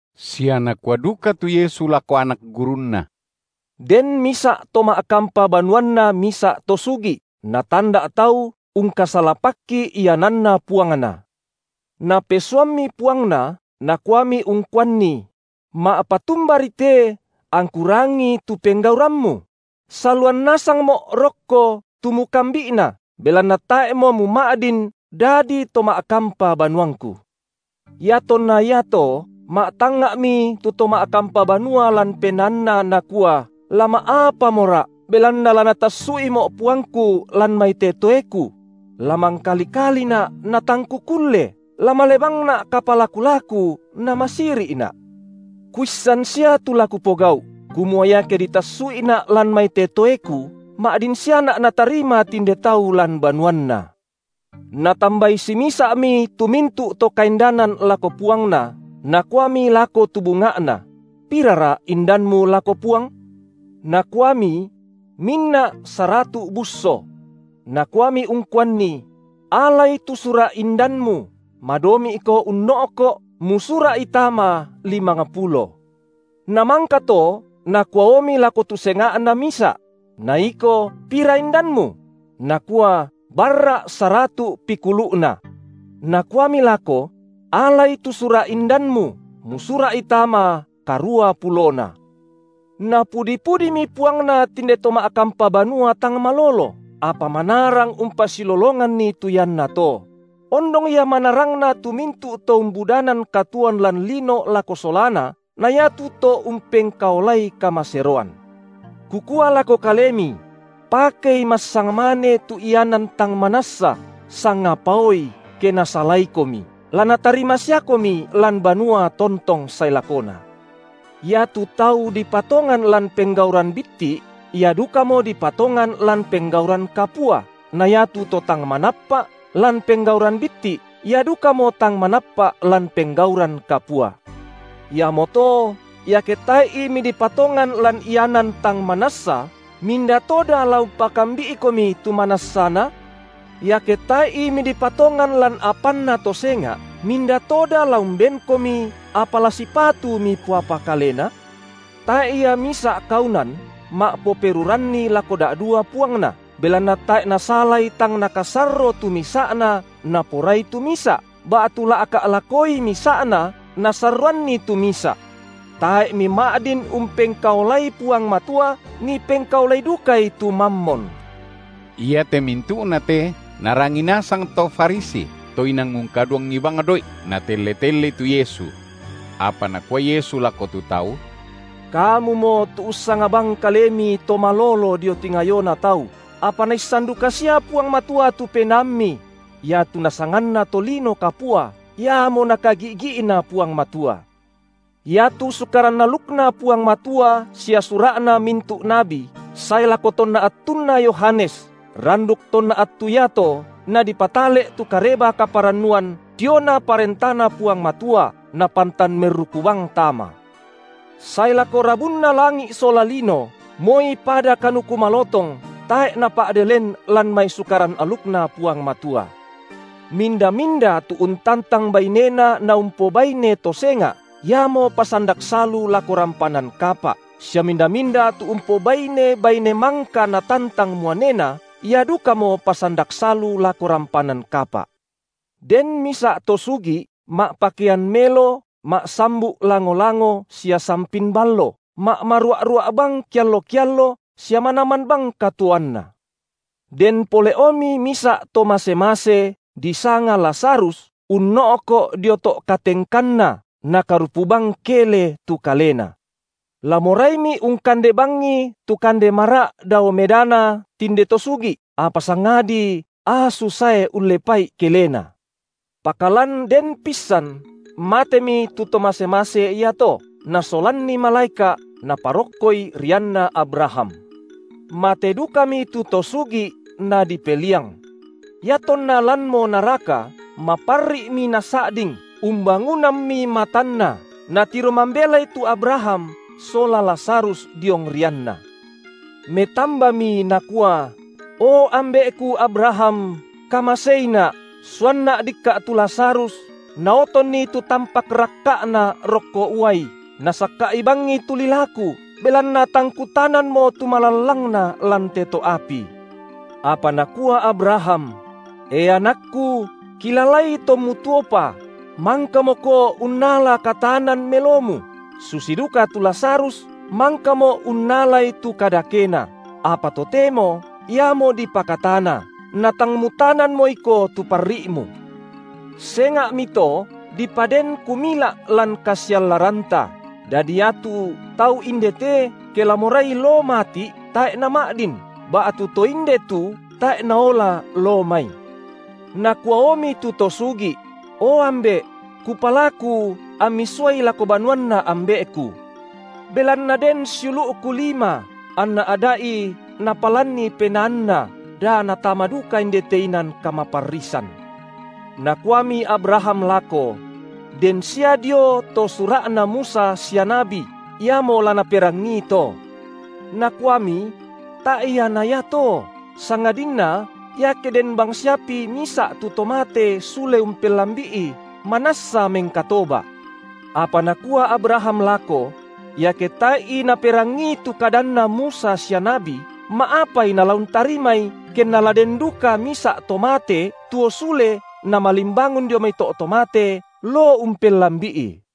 Sia Nakua duka tu Yesu lako anak gurunNa: Den misa’ to ma’kampa banuanna misa’ to sugi’, natanda’ tau ungkasalapakki iananna puangna. Napesuammi puangna, nakuami ungkuanni: Ma’patumbari te angku rangii tu penggaurammu? saluan nasangmo’ rokko tu mukambi’na, belanna tae’mo muma’din dadi to ma’kampa banuangku. Iatonna iato ma’tangnga’mi tu to ma’kampa banua lan penaanna, nakua: La ma’apamora’, belanna la natassu’imo’ puangku lan mai te toeku? La mangkali-kalina’ natang kukulle, la male bangna’ kapalaku-laku na masiri’na’. Kuissan sia tu la kupogau’, kumua iake ditassu’ina’ lan mai te toeku, ma’din siana’ natarima tinde tau lan banuanna. Natambai simisa’mi tu mintu’ to kaindanan lako puangna, nakuami lako tu bunga’na: Pirara indanmu lako puang? Nakuami: Minna’ saratu’ busso. Nakuami ungkuanni: Alai tu sura’ indanmu, madomi’ko unno’ko’, musura’i tama limangpulo. Namangka to nakuaomi lako tu senga’na misa’: Na iko pira indanmu? Nakua: Barra’ saratu’ pikulu’na. Nakuami lako: Alai tu sura’ indanmu, musura’i tama karua pulona. Napudi-pudimi puangna tinde to ma’kampa banua tang malolo, apa manarang umpasilolonganni tu iannato; ondong ia manarangna tu mintu’ to umbudanan katuoan lan lino lako solana na iatu to umpengkaolai kamaseroan. Kukua lako kalemi: Pakei massangmane tu ianan tang manassa, sangapaoi, ke nasalaikomi, la natarima siakomi lan banua tontong sae lakona. Iatu tau dipatongan lan penggauran bitti’, ia dukamo dipatongan lan penggauran kapua na iatu to tang manappa’ lan penggauran bitti’, ia dukamo tang manappa’ lan penggauran kapua. Iamoto iake tae’i midipatongan lan ianan tang manassa, minda toda la umpakambi’ikomi tu manassana? Iake tae’i midipatongan lan apanna to senga’, minda toda la umbenkomi apa la sipatu mipoapa kalena? Tae’ ia misa’ kaunan ma’poperuranni lako da’dua puangna, belanna tae’ nasalai tang nakasorro tu misa’na, naporai tu misa’, ba’tu la’ka’ lakoi misa’na, nasarroanni tu misa’. Tae’ mima’din umpengkaolai Puang Matua, mipengkaolai dukai tu Mammon. Iate mintu’na te narangi nasang to Farisi, to inang ungkaduangi bang doi’, natelle-tellei tu Yesu. Apa Nakua Yesu lako tu tau: Kamumo tu ussanga bang kalemi to malolo dio tingayona tau, apa Naissan duka sia Puang Matua tu penaammi; iatu nasanganna tolino kapua, iamo Nakagi’gi’na Puang Matua. Iatu Sukaran alukNa Puang Matua sia sura’na mintu’ nabi sae lako tonna attunna Yohanes, randuk tonna attu iato nadipatale’ tu Kareba-kaparannuan diona ParentaNa Puang Matua napantan merruku bang tama. Sae lako rabunna langi’ sola lino, moi pada kanuku malotong tae’ napa’de len lan mai Sukaran alukNa Puang Matua. Minda-minda tu untantang bainena naumpobaine to senga’, iamo pasandak salu lako rampanan kapa’ sia minda-minda tu umpobaine baine mangka natantang muanena, ia dukamo pasandak salu lako rampanan kapa’. Den misa’ to sugi’ ma’pakean melo ma’sambu’ lango-lango sia sampin ballo, ma’marua’-rua’ bang kiallo-kiallo sia manaman bang katuoanna. Den pole’omi misa’ to mase-mase, disanga Lazarus unno’ko’ dio to’ katengkanna, nakarupu bang kele tu kalena; la moraimi ungkande bangi tu kande mara’ dao medana tinde to sugi’, apa sangadi asu sae ullepa’i kelena. Pakalan den pissan matemi tu to mase-mase iato, nasolanni malaeka’, naparokkoi rianna Abraham. Mate dukami tu to sugi’, nadipeliang. Iatonna lanmo naraka, maparri’mi nasa’ding, umbangunammi matanna, natiro mambelai tu Abraham sola Lazarus diong rianna. Metambami nakua: O ambe’ku Abraham, kamaseina’, suanna’ dikka’ tu Lazarus, naotonni tu tampak rakka’na rokko uai, nasakka’i bangi tu lilaku, belanna tang kutananmo tu malallangna lan te to’ api. Apa nakua Abraham: E anakku, kilalai tommu tuopa mangkamoko unnala kataanan melomu, susi duka tu Lazarus mangkamo unnalai tu kadakena, apa totemo iamo dipakatana, natang mutananmo iko tu parri’mu. Senga’mito dipaden kumila’ lan kasiallaranta, dadi iatu tau inde te, ke la morai loo mati’, tae’ nama’din, ba’tu to inde tu tae’ naola loo mai. Nakuaomi tu to sugi’: O ambe’! kupalaku ammi suai lako banuanna ambe’ku, belanna den siulu’ku lima, anna ada’i napalanni penaanna, da natama duka indete inan kamaparrisan. Nakuami Abraham lako: Den sia dio to Sura’na Musa sia nabi: iamo la naperangii to. Nakuami: Tae’ ia na iato, sangadinna, iake den bangsiapi misa’ tu to mate sule umpellambi’i, manassa mengkatoba’. Apa nakua Abraham lako: Iake tae’i naperangii tu kadanna Musa sia nabi, ma’apai nala untarimai, kenna la den duka misa’ to mate tuo sule namalimbangun dio mai to’ to mate loo umpellambi’i!